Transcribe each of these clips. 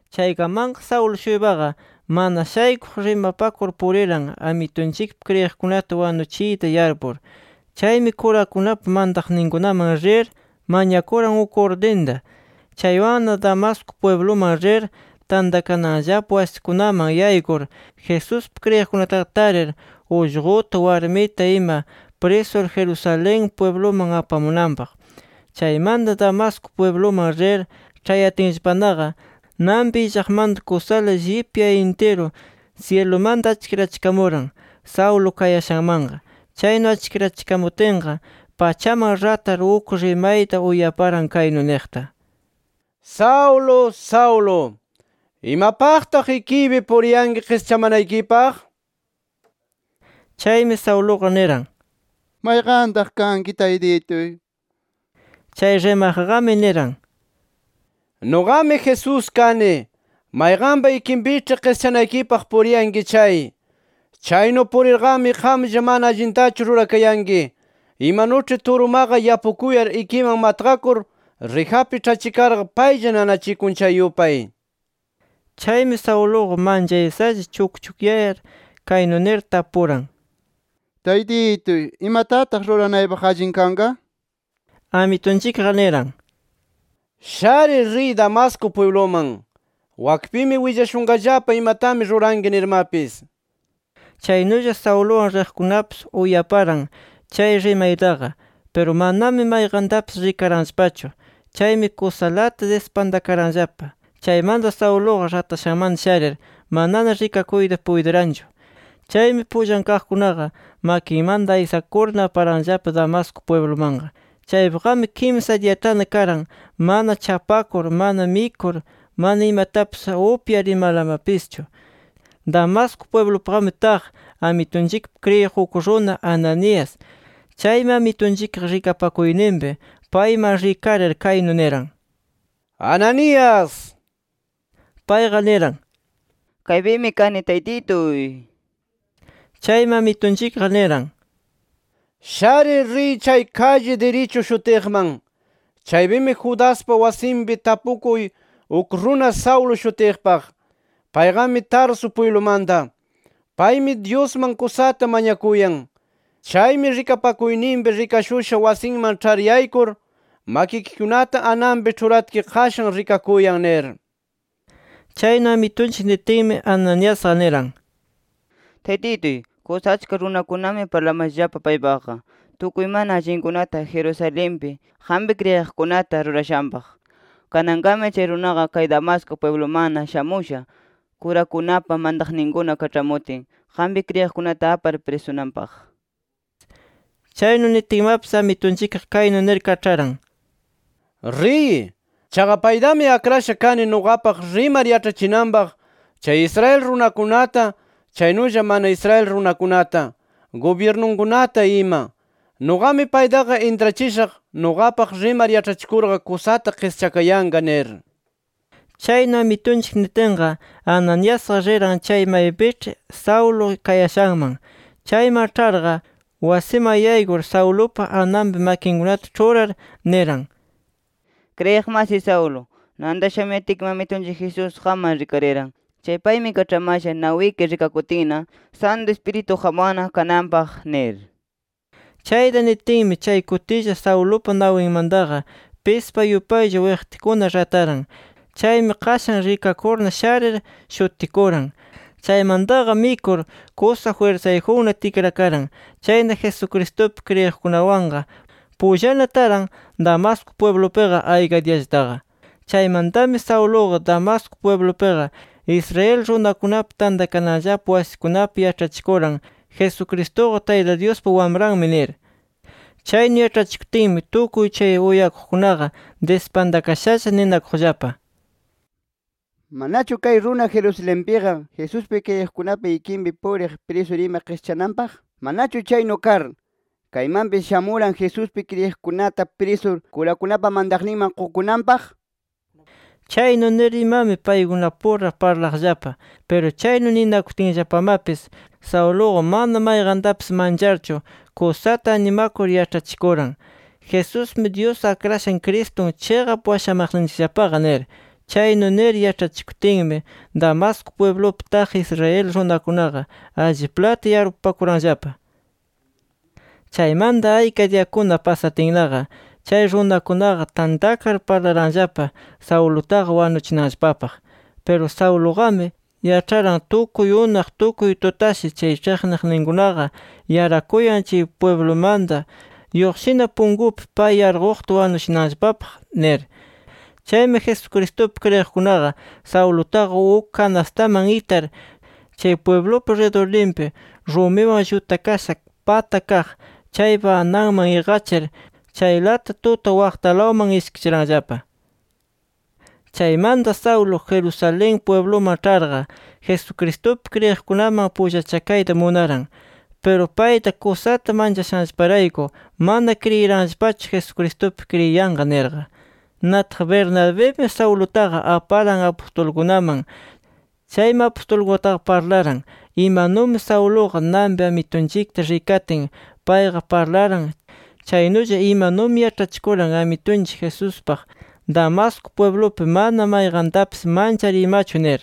Chaykamanqa Saulo-shuypaqa mana shaykuq, rimapakur puriran, Amitunchikpi kriyiqkunata wanuchiyta yarpur. Chaymi kurakunapa mantaqninkunaman rir mañakuran uk urdinta. Chaywanna Damasco pwibluman rir, tantakananllapa wasikunaman yaykur Jesuspi kriyiqkunataqa tarir ullquta, warmita ima prisur Jerusalén pwibluman apamunanpaq. Chaymanta, Damasco pwibluman rir ĉhayatinllapanaqa, nanpi illaqmanta kusala llipya intiru, syilumanta achkirachikamuran Saulo kayashanmanqa. Chaynu achkirachikamutinqa, pachaman ratar, uk rimayta uyaparan kaynu niqta: “¡Saulo, Saulo! ¿Imapaqtaq ikiypi puriyanki qischamanaykipaq?” nir. Chaymi Sauluqa niran: “¿Mayqantaq kanki, Taytituy?” Chay rimaqqami niran: “Nuqami Jesús kani, mayqanpa ikinpiĉhi qischanaykipaq puriyanki chay. [Chaynu purirqami qamlla mana allintachu rurakayanki, imanuĉhi turumaqa yapukuyar, ikiman matqakur, rijapi ĉhachikarqa paylla nanachikun chay yupay”. Chaymi Sauluqa manchaysalla chukchukyayar, kaynu nir tapuran: “Taytituy, ¿imatataq ruranaypaq allin kanqa?” nir Amitunchikqa niran:] “Sharir, riy Damasco pwibluman. Wakpimi willashunqallapa imatami ruranki nirmapis”. Chaynulla Sauluwan riqkunapis uyaparan chay rimaytaqa. Piru manami mayqantapis rikaranllapachu. Chaymi kusalata dispantakaranllapa. Chaymanta, Sauluqa ratashanmanta sharir, manana rikakuyta puytiranchu. Chaymi pullan kaqkunaqa, makinmanta aysakurna, aparanllapa Damasco pwiblumanqa. Chaypiqami kimsa diyatana karan mana chapakur; mana mikur, mana imatapis upyar imalamapischu. Damasco pwiblupiqami taq Amitunchikpi kriyiq uk runa Ananías. Chaymi Amitunchikqa, rikapakuyninpi payman rikarir, kaynu niran: “¡Ananías!” Payqa niran: “Kaypimi kani, Taytituy” nir. Chaymi, Amitunchikqa niran: “Sharir, riy chay kalli Dirichu shutiqman. Chaypimi Judaspa wasinpi tapukuy uk runa Saulo shutiqpaq. Payqami Tarso pwiblumanta. Paymi Dyusman kusata mañakuyan. Chaymi, rikapakuyninpi rikashusha wasiman ĉhar yaykur, makikikunata ananpi ĉhuratki qashan rikakuyan” nir. Chaynu Amitunchik nitinmi, Ananiasqa niran: “Taytituy, kusa achka runakunami parlamashallapa paypaqqa, tukuy mana allinkunata Jerusalenpi qampi kriyiqkunata rurashanpaq. Kananqami chay runaqa kay Damasco pwiblumanna shamusha, kurakunapa mantaqninkuna kaĉhamutin, qampi kriyiqkunata apar prisunanpaq” nir. Chaynu nitinmapis, Amitunchikqa kaynu nir kaĉharan: “Riy. Chaqa paytami akrasha kani nuqapaq rimar yaĉhachinanpaq chay Israel runakunata, chaynulla mana Israel runakunata, gubyirnunkunata ima. Nuqami paytaqa intrachishaq, nuqapaq rimar yaĉhachikurqa kusata qischakayanqa” nir. Chaynu Amitunchik nitinqa, Ananiasqa riran, chay maypiĉhi Saulo kayashanman. Chayman ĉharqa, wasiman yaykur Saulupa ananpi makinkunata ĉhurar, niran: —Kriyiq masiy Saulo, nanta shamuyatki Amitunchik Jesús qamman rikariran chay paymi kaĉhamasha nawiki rikakutinna, Santu Ispiritu qamwanna kananpaq nir. Chayta nitinmi chay kutilla, Saulupa nawinmantaqa pispa yupaylla wiqtikuna rataran. Chaymi qashan rikakurna sharir shutikuran. Chaymantaqa mikur kusa jwirsayjunna tikrakaran. Chayna Jesucristupi kriyiqkunawanqa pullana taran Damasco pwiblupiqa, ayka diyallataqa. Chaymantami Sauluqa, Damasco pwiblupiqa Israel runakunapa tantakananllapa wasikunapi yaĉhachikuran, “Jesucristuqa, Tayta Dyuspa Wamranmi” nir. Chaynu yaĉhachikutinmi, tukuy chay uyakuqkunaqa dispantakashalla ninakuqllapa: “¿Manachu kay runa Jerusalenpiqa, Jesuspi kriyiqkunapa ikinpi puriq prisur ima qischananpaq? ¿Manachu chaynu kar, kaymanpis shamuran Jesuspi kriyiqkunata prisur, kurakunapa mantaqninman qukunanpaq?” nir. Chaynu nir imami, paykunapura parlaqllapa. Piru chaynu ninakutinllapamapis, Sauluqa mana mayqantapis mancharchu, kusata animakur yaĉhachikuran: “Jesusmi, Dyus Akrashan Cristun chiqap washamaqninchikllapaqa” nir. Chaynu nir yaĉhachikutinmi, Damasco pwiblupi taq Israel runakunaqa alliplata yarpupakuranllapa. Chaymanta, ayka diyakuna pasatinnaqa, chay runakunaqa tantakar parlaranllapa Saulutaqa wanuchinanllapapaq. Piru Sauluqami yaĉharan, tukuy unaq, tukuy tutashi chay ĉhiqniqninkunaqa yarakuyan, chay pwiblumanta lluqshina punkupi, pay yarquqta wanuchinanllapapaq nir. Chaymi Jesucristupi kriyiqkunaqa Saulutaqa uk kanastaman itar, chay pwiblupa ridurninpi rumiwan llutakasha pata kaq chaypa ananman iqachir, chaylata tuta waqtalawman ishkichiranllapa. Chaymanta Saulo, Jerusalén pwibluman ĉharqa, Jesucristupi kriyiqkunaman pullachakayta munaran. Piru payta kusata manchashanllaparayku mana kriyiranllapachu, “Jesucristupi kriyiyanqa” nirqa. Nataq Bernabimi Saulutaqa aparan apustulkunaman. Chaymi apustulkunataqa parlaran, imanumi Sauluqa nanpi Amitunchikta rikatin, payqa parlaran, chaynulla imanumi yaĉhachikuran Amitunchik Jesuspaq Damasco pwiblupi, mana mayqantapis manchar imachu nir.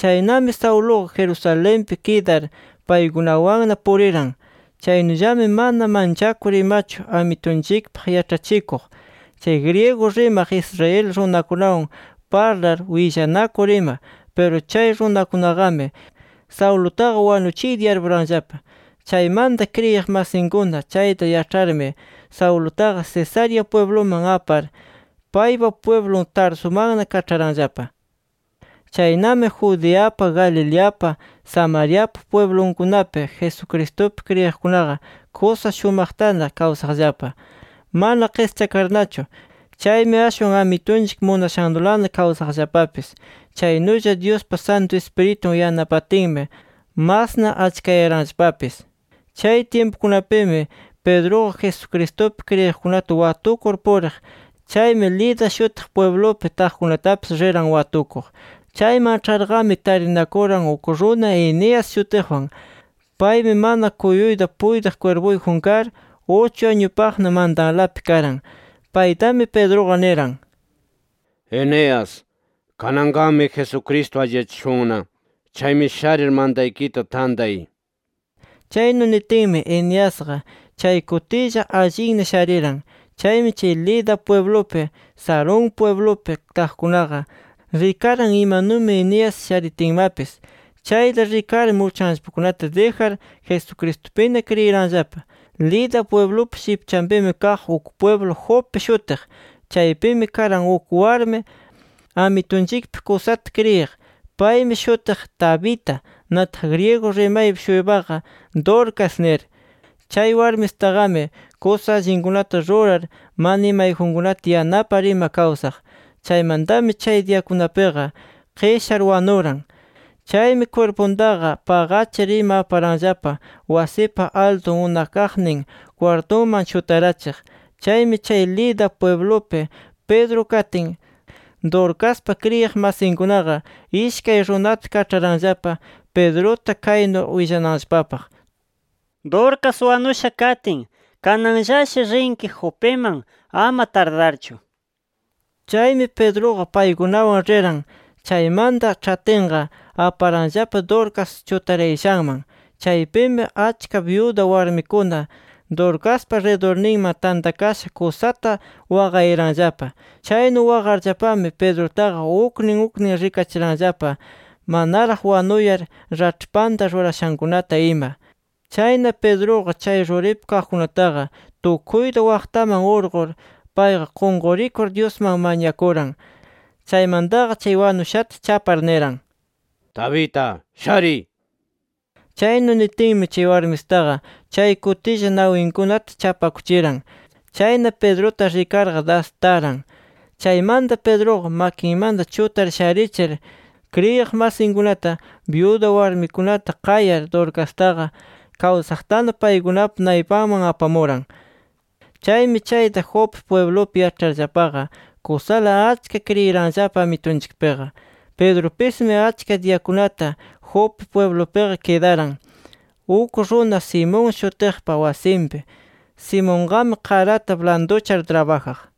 Chaynami Sauluqa Jerusalenpi kidar, paykunawanna puriran. Chaynullami mana manchakur imachu Amitunchikpaq yaĉhachikuq, chay griego rimaq Israel runakunawan parlar, willanakur ima. Piru chay runakunaqami Saulutaqa wanuchiyta yarpuranllapa. Chaymanta kriyiq masinkuna chayta yaĉharmi, Saulutaqa Cesarea pwibluman apar, paypa pwiblun Tarsumanna kaĉharanllapa. Chaynami Judeapa, Galileapa, Samariapa pwiblunkunapi Jesucristupi kriyiqkunaqa kusa shumaqtana kawsaqllapa, mana qischakarnachu. Chaymi ashwan Amitunchik munashannulana kawsaqllapapis. Chaynulla Dyuspa Santu Ispiritun yanapatinmi, masna achkayaranllapapis. Chay tyimpukunapimi Pedruqa, Jesucristupi kriyiqkunata watukur puriq. Chaymi Lida shutiq pwiblupi taqkunatapis riran watukuq. Chayman ĉharqami, tarinakuran uk runa Eneas shutiqwan. Paymi mana kuyuyta puytiq kwirpuyjun kar, uchu añupaqna mantanlapi karan. Paytami Pedruqa niran: —Eneas, kananqami Jesucristo alliyachishunna. Chaymi sharir, mantaykita tantay nir. Chaynu nitinmi, Eneasqa chay kutilla allinna shariran. Chaymi, chay Lida pwiblupi, Sarón pwiblupi taqkunaqa, rikaran imanumi Eneas sharitinmapis. Chayta rikarmi, uchanllapakunata dijar, Jesucristupina kriyiranllapa. Lida pwiblupa shipchanpimi kaq uk pwiblu Jope shutiq. Chaypimi karan uk warmi, Amitunchikpi kusata kriyiq. Paymi shutiq Tabita. Nataq, griego rimaypi-shuypaqa “Dorcas” nir. Chay warmisitaqami kusa allinkunata rurar, mana imayjunkunata yanapar ima kawsaq. Chaymantami chay diyakunapiqa qishar wanuran. Chaymi kwirpuntaqa paqachir ima aparanllapa wasipa altun unakaqnin kwartuman chutarachiq. Chaymi chay Lida pwiblupi Pedro katin, Dorcaspa kriyiq masinkunaqa ishkay runata kaĉharanllapa, Pedruta kaynu willananllapapaq: “Dorcas wanusha katin, kananllashi rinki Jopiman, ama tardarchu” nir. Chaymi Pedruqa paykunawan riran. Chaymanta ĉhatinqa, aparanllapa Dorcas chutarayashanman. Chaypimi achka byuda warmikuna, Dorcaspa ridurninman tantakasha, kusata waqayaranllapa. Chaynu waqarllapami, Pedrutaqa uknin uknin rikachiranllapa, manaraq wanuyar raĉhpanta rurashankunata ima. Chayna Pedruqa, chay ruripi kaqkunataqa tukuyta waqtaman urqur, payqa qunqurikur Dyusman mañakuran. Chaymantaqa chay wanushata chapar, niran: —Tabita, shariy, nir. Chaynu nitinmi, chay warmisitaqa chay kutilla, nawinkunata chapakuchiran. Chayna Pedruta rikarqa, das taran. Chaymanta, Pedruqa makinmanta chutar sharichir, kriyiq masinkunata, byuda warmikunata qayar, Dorcastaqa kawsaqtana paykunapa naypanman apamuran. Chaymi chayta Jope pwiblupi yaĉharllapaqa, kusala achka kriyiranllapa Amitunchikpiqa. Pedrupismi, achka diyakunata Jope pwiblupiqa kidaran, uk runa Simón shutiqpa wasinpi. Simonqami qarata blanduchar trabajaq.